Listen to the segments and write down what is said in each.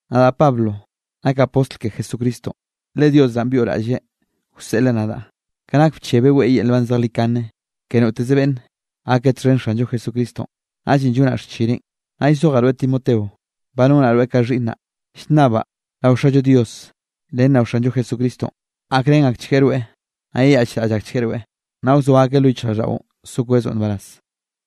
Nadaꞌ Pablo nakaꞌ postl ke Jesucristonꞌ, le Dios naꞌn byoꞌraꞌlleꞌ wseꞌleꞌ nadaꞌ, ka nak bchebeꞌ weꞌe yel nban zejlikane ke noteze beꞌnn gake txhen Xanllo Jesucristonꞌ, naꞌllenꞌ llonaꞌ xchineꞌn. Naꞌ llzojaꞌ rweꞌ Timoteo, ba nonaꞌ rweꞌ ka xhiꞌnnaꞌ. Llnnabaꞌ rao Xallo Dios ren rao Xanllo Jesucristonꞌ, gakrén akchgueꞌ rweꞌ, naꞌ yeyaꞌchraꞌll akchgueꞌ rweꞌ, naꞌ wzoa akeꞌ lo yichjraꞌlldaꞌo so kwezoꞌ nbaraz.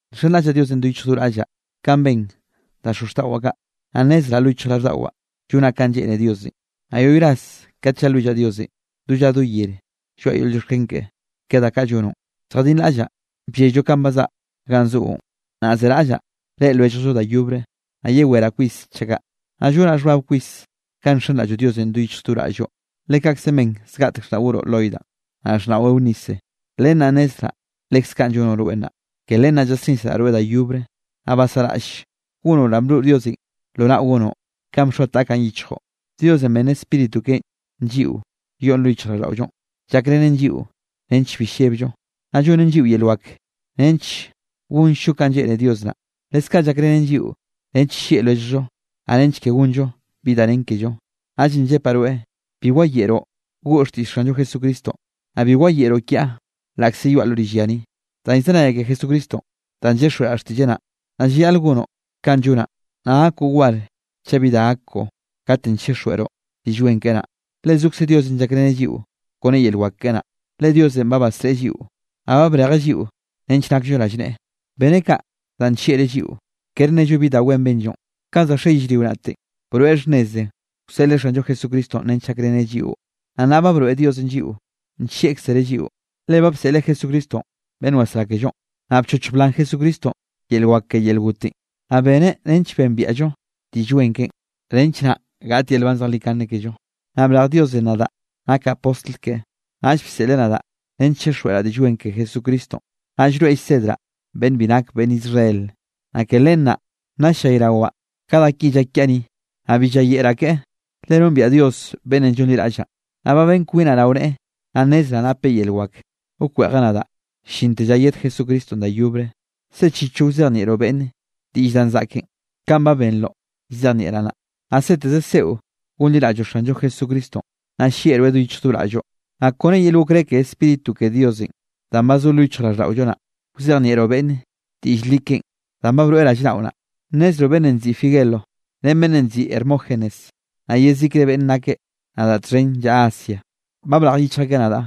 Nxenraꞌllaꞌ Diosenꞌ do yichj do raꞌllaꞌ kanꞌ ben da xozxtaꞌwaꞌ kaꞌ, naꞌ nnezraꞌ lo yichjraꞌlldaꞌwaꞌ llonaꞌ kanꞌ lleꞌne Diosenꞌ. Naꞌ yoꞌy ras kate llalwillaꞌ Diosenꞌ, do lla do yere lloaꞌa yel llioxken keꞌe, ke da kaꞌ llonoꞌn. Lljadinraꞌllaꞌ bllelloꞌ ka bazaꞌa ganꞌ zoꞌon, naꞌ zeraꞌllaꞌ reꞌe lwelljllo da yobre, naꞌ yeweraꞌ kwis chaꞌ kaꞌ. Naꞌ llonaꞌ xhbab kwis kanꞌ nxenraꞌlloꞌ Diosenꞌ do yichj do raꞌlloꞌ, le kaꞌkze ben zgaꞌtek xhnaꞌ goroꞌ Loida, naꞌ xhnaꞌo Eunice, len naꞌ nnezraꞌ lekze kaꞌn llonoꞌ rweꞌ nnaꞌ. Ke len naꞌ llasnisraꞌ rweꞌ da yobre, naꞌ basaꞌraꞌll gonoꞌ danꞌ broꞌ Diosenꞌ lo naꞌo gonoꞌ, kanꞌ bxoa taꞌkaꞌn yichjoꞌn. Diosenꞌ benneꞌ Spíritu keꞌen lliꞌo yoꞌn lo yichjraꞌlldaꞌollonꞌ, llakrenen lliꞌo nench bi llebllo, naꞌ llonnen lliꞌo yel wak nench gonllo kanꞌ lleꞌne Dios naꞌ. Leskaꞌ llakrenen lliꞌo nench nllieꞌ lwelljllo, naꞌ nench ke gonllo bi da nen kello. Naꞌllenꞌ llepaꞌ rweꞌ, bi wayeꞌroꞌ goꞌo xtiꞌll Xanllo Jesucristonꞌ, naꞌ bi wayeꞌroꞌ kiaꞌ laꞌkze yoaꞌ lo rill ya ni, danꞌ llzenayaꞌ ke Jesucristonꞌ danꞌ llyixjweꞌraꞌ xtiꞌlleꞌ naꞌ. Naꞌ llayaꞌl gonoꞌ kanꞌ llonaꞌ, naꞌ gakoꞌ war chaꞌ bi da gak koꞌo, katenꞌ chixjweꞌroꞌ Diꞌll Wen keꞌe naꞌ, le zokze Diosenꞌ llakreneꞌ lliꞌo kone yel wak keꞌe naꞌ. Le Diosenꞌ ba basreꞌe lliꞌo, naꞌ ba brejeꞌ lliꞌo nench nakllo rallneꞌe. Beneꞌ kaꞌ, danꞌ nllieꞌreꞌ lliꞌo, kere nello bi da wen benllo. Kanꞌ za xe yellrio naꞌte, broeꞌ xhnneze wseꞌleꞌ Xanllo Jesucristonꞌ nench gakreneꞌ lliꞌo. Naꞌ nnaꞌ ba broeꞌ Diosenꞌ lliꞌo nllieꞌkzereꞌ lliꞌo, le ba bseꞌleꞌ Jesucristonꞌ beꞌnn wasrá kellonꞌ. Naꞌ bchochj blan Jesucristonꞌ yel wak ke yel gotenꞌ, naꞌ beneꞌ nench bembiaꞌllo Diꞌll Wen keꞌen, nench naꞌ gaꞌt yel nban zejlikane kello. Naꞌ brej Diosenꞌ nadaꞌ nakaꞌ postl keꞌe, naꞌll bseꞌleꞌ nadaꞌ nench chixjweꞌraꞌ Diꞌll Wen ke Jesucristonꞌ, naꞌ llroeꞌ llsedraꞌ beꞌnne bi nake beꞌnn Israel. Naꞌ ke len naꞌ ll-llayrawaꞌ ka da ki llak kiaꞌ ni, naꞌ bi llayeꞌraꞌ ke, le nombiaꞌ Dios beꞌnnenꞌ llonliraꞌllaꞌn. Naꞌ ba ben kwinaꞌ rao neꞌe, naꞌ nnezraꞌ napeꞌ yel wak wkweꞌjeꞌ nadaꞌ llinte lla yed Jesucristonꞌ da yobre. Sechichoꞌ wzejnieꞌroꞌ beꞌnne diꞌll danꞌ zaꞌken, kanꞌ ba benroꞌ llzejnieꞌraꞌ naꞌ, naꞌ seteze seꞌo gonliraꞌlloꞌ Xanllo Jesucristonꞌ, naꞌ llieꞌroeꞌ do yichj do raꞌlloꞌ. Naꞌ kone yel okré ke Spíritu ke Diosenꞌ danꞌ ba zo lo yichjraꞌlldaꞌollo naꞌ, wzejnieꞌroꞌ beꞌnne diꞌll li keꞌen danꞌ ba broeꞌ rallnaꞌo naꞌ. Nnezroꞌ beꞌnnenꞌ nziꞌi Figelo ren beꞌnnenꞌ nziꞌi Hermógenes, naꞌ yezikre beꞌnn nake nadaꞌ txhen llaꞌa Asia, ba brej yichj akeꞌ nadaꞌ.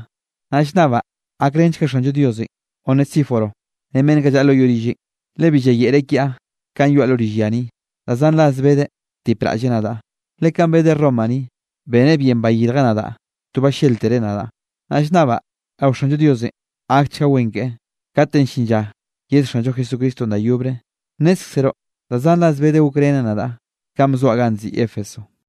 Naꞌ llnnabaꞌ gakrenchga Xanllo Diosenꞌ Onesíforo, ren beꞌnn kaꞌ llaꞌa lo yoꞌ rilleꞌn, le bi bayeꞌreꞌ kiaꞌ kanꞌ yoaꞌ lo rill ya ni, da zan ras bedeꞌ btipraꞌlleꞌ nadaꞌ. Le kanꞌ bedeꞌ Roma ni, beneꞌ bien bayirjeꞌ nadaꞌ to balléltereꞌ nadaꞌ. Naꞌ llnnabaꞌ rao Xanllo Diosenꞌ gakchga wen keꞌe, katenꞌ llin lla yed Xanllo Jesucristonꞌ da yobre. Nnézkzeroꞌ da zan ras bedeꞌ gokreneꞌ nadaꞌ kanꞌ bzoaꞌ ganꞌ nziꞌi Éfeso.